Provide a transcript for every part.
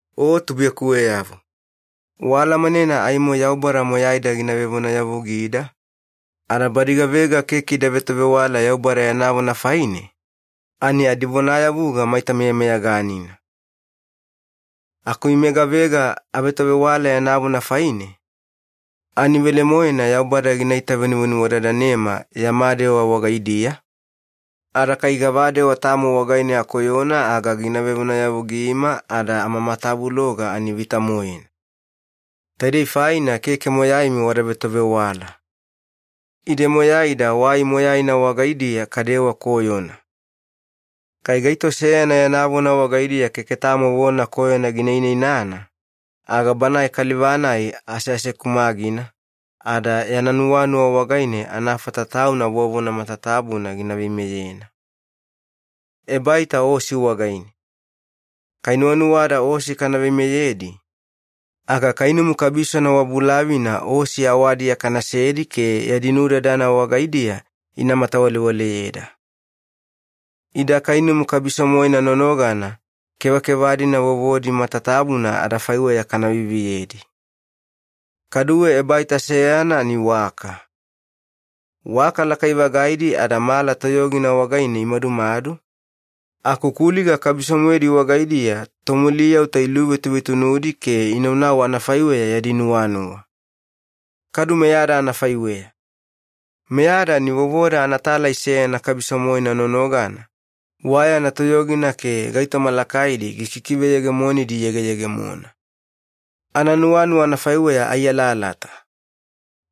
O tubuiyakuweyavo, waalamanena aimo Yaubada moyaida gina vevonayavugida, ada badi gavega keke ida vetovewala Yaubada yana vona faine, ani adivonayavuga maita meyameyaganina. Aku ime gavega avetovewala yana vona faine, ani velemoena Yaubada ginaita venuwadadanema yama dewa wagaidiya, ada kai gavadewa tamo wagaine akoyona aga gina vevonayavugima ada amamatavuloga ani vita-moena. Taidei faina keke moyaimi wada vetovewala. Ide moyaida wai moyaina wagaidiya kadewa koyona. Kai gaito seyana yana vona wagaidiya keke tamo vona koyona gina inainana, aga banae kaliva-nai aseasekumagina ada yana nuwanuwa wagaine anafata tauna vovona matatabuna gina veimeyena. Ebaita osi wagaine. Kai nuwanuwada osi kana veimeyedi, aga kainumu kabisona wa bulavina osi awadiya kanasedi ke yada nudadana wagaidiya ina matawalewaleyeda. Ida kainumu kabiso-moena nonogana kevakeva-dina vovodi matatabuna adafaiweya kana viviyedi. Kaduwe ebaita seyana ani waka. Waka lakai-vagaidi ada mala toyogina wagaine imadumadu, aku kuliga kabiso-moedi wagaidiya tomuliyauta iluvetuvetunudi ke inanau anafaiweya yadi nuwanuwa. Kadu meyada anafaiweya. Meyada ani vovoda anatalai seyana kabiso-moena nonogana wa yana toyogina ke gaitoma lakaidi gikikiveyegemonidi iyegeyegemona. Ananuwanuwa anafaiweya ai alalata.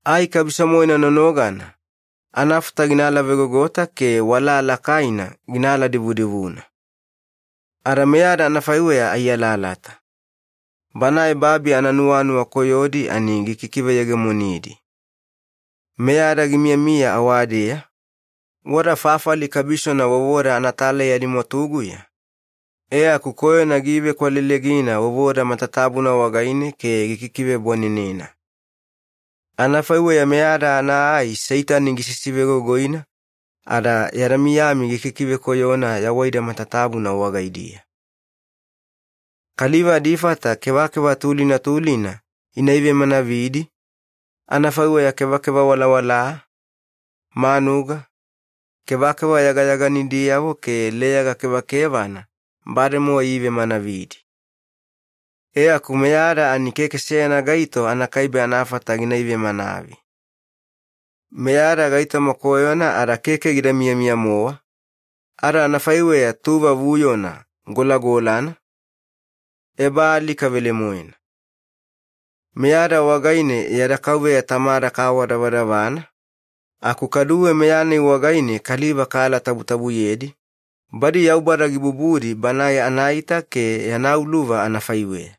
Ai kabiso-moena nonogana anafata gina alavegogota ke wala lakaina gina aladivudivuna. Ada meyada anafaiweya ai alalata. Banae babi ananuwanuwa koyodi ani gikikiveyegemonidi. Meyada gimiyamiya awadeya, wada fafali kabisona vovoda anatalai adimwatuguya, e aku koyona giive akwalelegina vovoda matatabuna wagaine ke gikikivebwanenena. Anafaiweya meyada ana ai Seitani gisisivegogoina ada yada miyami gikikivekoyona yawaida matatabuna wagaidiya. Kaliva adifata kevakeva tulina tulina ina ivemanavidi, anafaiweya kevakeva walawala, manuga, kevakeva yagayaganidiyavo ke leyaga kevakevana bademowa iivemanavidi. E aku meyada ani keke seyana gaito anakaibe anafata gina ivemanavi. Meyada gaitoma koyona ada keke gida miyamiya-mowa, ada anafaiweya tuva vuyona golagolana, ebaalika velemoena. Meyada wagaine yada Kauveya Tamada kaawadavadavana, aku kaduwe meya-nai wagaine kaliva kaalatabutabuyedi, badi Yaubada gibubudi Banae anaita ke yana uluva anafaiweya.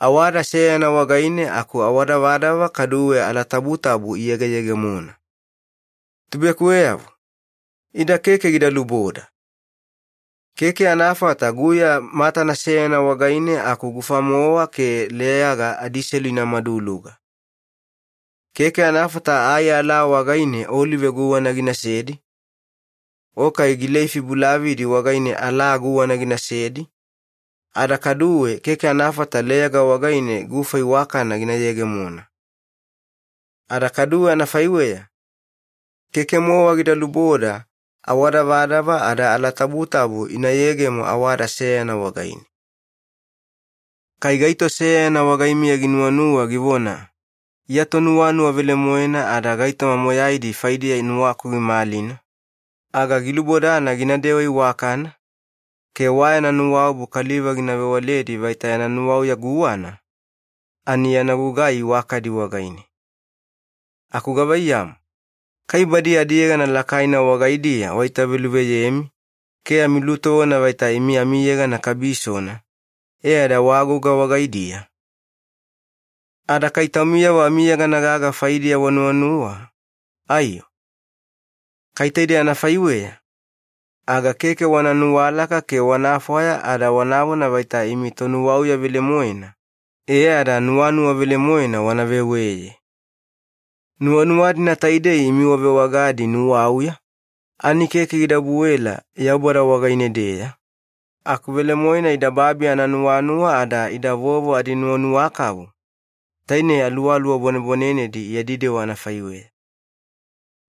Awada seyana wagaine aku awadavadava kaduwe alatabutabu iyegeyegemona. Tubuiyakuweyavo, ida keke gida luboda! Keke anafata guya matana seyana wagaine aku gufa-mowa ke leyaga adiselu ina maduluga. Keke anafata ai alaa wagaine olive guwana ginasedi, o kai gileifi bulavadi wagaine alaa guwana ginasedi, ada kaduwe keke anafata leyaga wagaine gufa iwakana gina yegemona. Ada kaduwe anafaiweya, keke-mowa gida luboda awadavadava ada alatabutabu ina yegemo awada seyana wagaine. Kai gaito seyana wagaimiya ginuwanuwa givona, “Iya tonuwanuwa velemoena, ada gaitoma moyaidi faidiya nuwaku gimalina,” aga gilubodana ginadewa iwakana ke wa yana nuwaobu kaliva gina vewaledi vaita yana nuwauya guwana ani yana gugai iwakadi wagaine. Aku gavaiyamu, kai badi adiyegana lakaina wagaidiya waitaveluveyemi ke amilutovona vaita imi amiyegana kabisona, e ada waagouga wagaidiya? Ada kai taumiyavo amiyegana gaga faidiya wanuwanuwa, aiyo? Kai taidei anafaiweya, aga keke wana nuwalaka ke wana fwaya ada wanavona vaita imi tonuwauya velemoena, e ada nuwanuwa velemoena wana veweye. Nuwanuwa-dina taidei imi wavewagadi ‘nuwauya’ ani keke gida obuela Yaubada wagaine-deya, aku velemoena ida babi ananuwanuwa ada ida vovo adinuwanuwa kavu, tainei aluwaluwa bwanebwanenedi yadi dewa anafaiweya.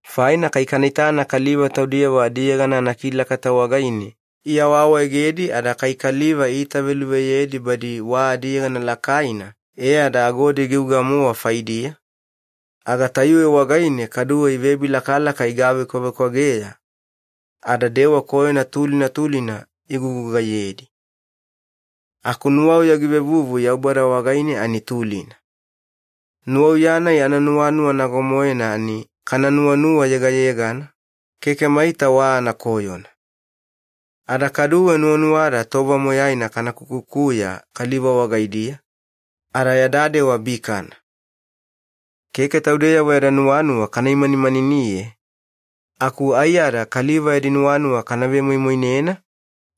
Faina kai kana itana kaliva taudiyavo adiyegana anakilakata wagaine iawaawaegedi ada kai kaliva iitaveluveyedi badi wa adiyegana lakaina e ada agodi giuga-mowa faidiya, aga tayuwe wagaine kaduwe ivebilakalaka igavekwavekwageya ada dewa koyona tulina tulina igugugaiyedi. Aku nuwauya givevuvu Yaubada wagaine ani tulina. Nuwauya-nai ananuwanuwa nago-moena ani kana nuwanuwa yegayegana, keke maita wa anakoyona. Ada kaduwe nuwanuwada tova moyaina kana kukukuya kaliva wagaidiya, ada yada dewa bikana. Keke taudeyavo yada nuwanuwa kana imanimaniniye, aku aiyada kaliva yadi nuwanuwa kana vemoimoinena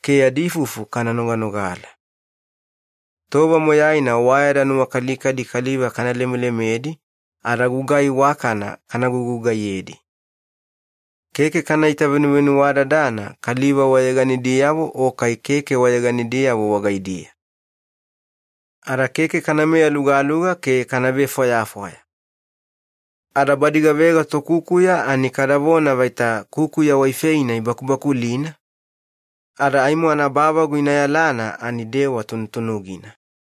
ke yadi ifufu kana noganogala. Tova moyaina wa yada nuwakalikali kaliva kana lemelemedi ada gugai iwakana kana gugugaiyedi. Keke kanaita venuvenuwadadana kaliva wayeganidiyavo o kai keke wayeganidiyavo wagaidiya. Ada keke kana meyalugaluga ke kana vefwayafwaya. Ada badi gavega tokukuya ani kadavona vaita kukuya waifeina ibakubakulina, ada aimo anabavagu ina yalana ani dewa tunutunugina.